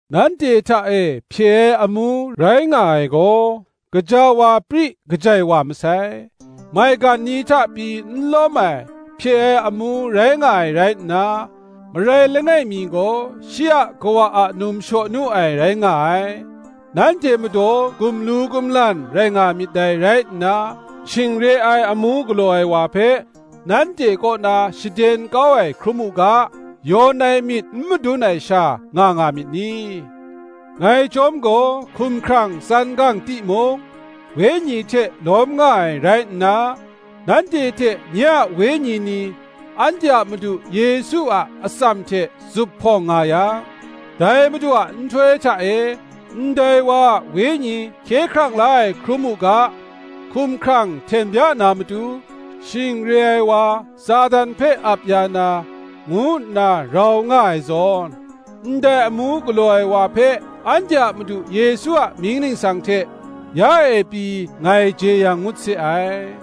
Nanhte hta e hpye ai amu rai nga ai gaw, gaja wa pri kajai wa masai: maigan ni hta pyi n lawm ai hpye ai amu rai nga ai rai nna, marai langai mi gaw shi a kawa a num shaw nu ai, rai nga ai. Nanhte madaw gumlu gumlan rai nga myit dai rai nna, shing re ai amu galaw ai wa hpe nanhte kaw na shaden kau ai hkrum u ga, yawn ai myit n madun ai sha nga nga myit ni? Ngai chyawm gaw, hkumhkrang tsan gang timung, wenyi hte lawm nga ai rai nna, nanhte hte nye a wenyi ni, anhte a Madu Yesu a atsam hte zuphpawng nga yang, dai Madu a nhtoi hta e, ndai wa a wenyi hkye hkrang la ai hkrum u ga, hkumhkrang hten bya na matu, shing re ai wa Satan hpe ap ya na, ngu nna rau nga ai zawn, ndai amu galaw ai wa hpe anhte a Madu Yesu a mying ningsang hte, ya e pyi ngai jeyang ngut se ai.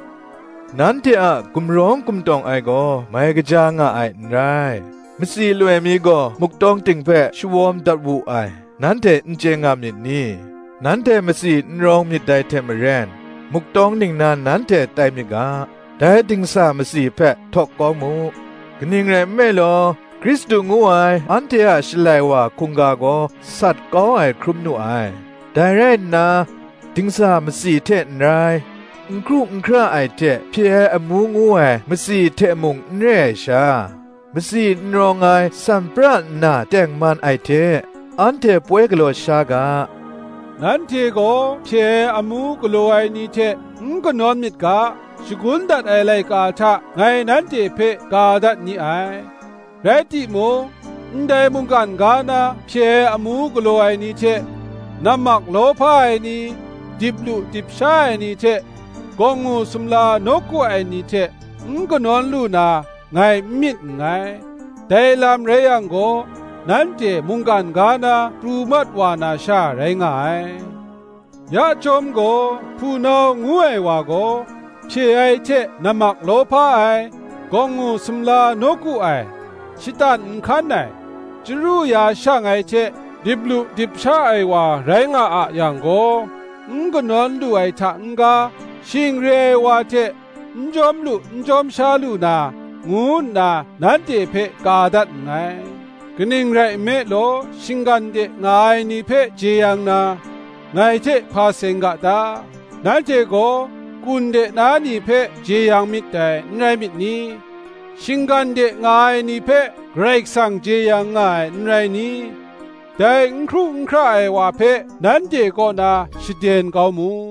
Nanhte a gumrawng gumtawng ai gaw mai kaja nga ai n rai. Matsi loi mi gaw muk tawng ting hpe shawawm dat wu ai, nanhte n chye nga myit ni? Nanhte matsi n rawng myit dai hte maren, muk tawng ningnan nanhte tai myit ga, dai dingsa matsi hpe htawk kau mu. Kaning rai nme law, Hkristu ngu ai anhte a Shalai wa hkungga gaw sat kau ai hkrum nu ai. Dai rai nna, dingsa matsi hte n rai, n hkru n hkra ai hte hpye ai amu ngu ai matsi hte mung n re ai sha, matsi n rawng ai san pra nna tengman ai hte, anhte poi galaw sha ga. Nanhte gaw hpye ai amu galaw ai ni hte n kanawn myit ga, shagun dat ai laika hta ngai nanhte hpe ka dat ni ai; rai timung, ndai mungkan ga na hpye ai amu galaw ai ni hte, nammak lawhpa ai ni, dip lu dip sha ai ni hte gawngngu sumla nawku ai ni hte n kanawn lu na, ngai n myit nngai: dai lam rai yang gaw, nanhte mungkan ga na pru mat wa na sha rai nga ai. Ya chyawm gaw, hpunau ngu ai wa gaw, hpye ai hte nammak lawhpa ai, gawngngu sumla nawku ai, shatan nhkan ai, chyaru ya shang ai hte dip lu dip sha ai wa rai nga a yang gaw, n kanawn lu ai hta n-ga, shing re ai wa hte n jawm lu n jawm sha lu na, ngu nna nanhte hpe ka dat nngai. Kaning rai nme law, shinggan de nga ai ni hpe jeyang na, ngai hte hpa seng ga ta? Nanhte gaw kata de na ni hpe jeyang myit dai, n rai myit ni? Shinggan de nga ai ni hpe Karai Kasang jeyang nga ai, n rai ni? Dai n hkru n hkra ai wa hpe nanhte kaw na shaden kau mu.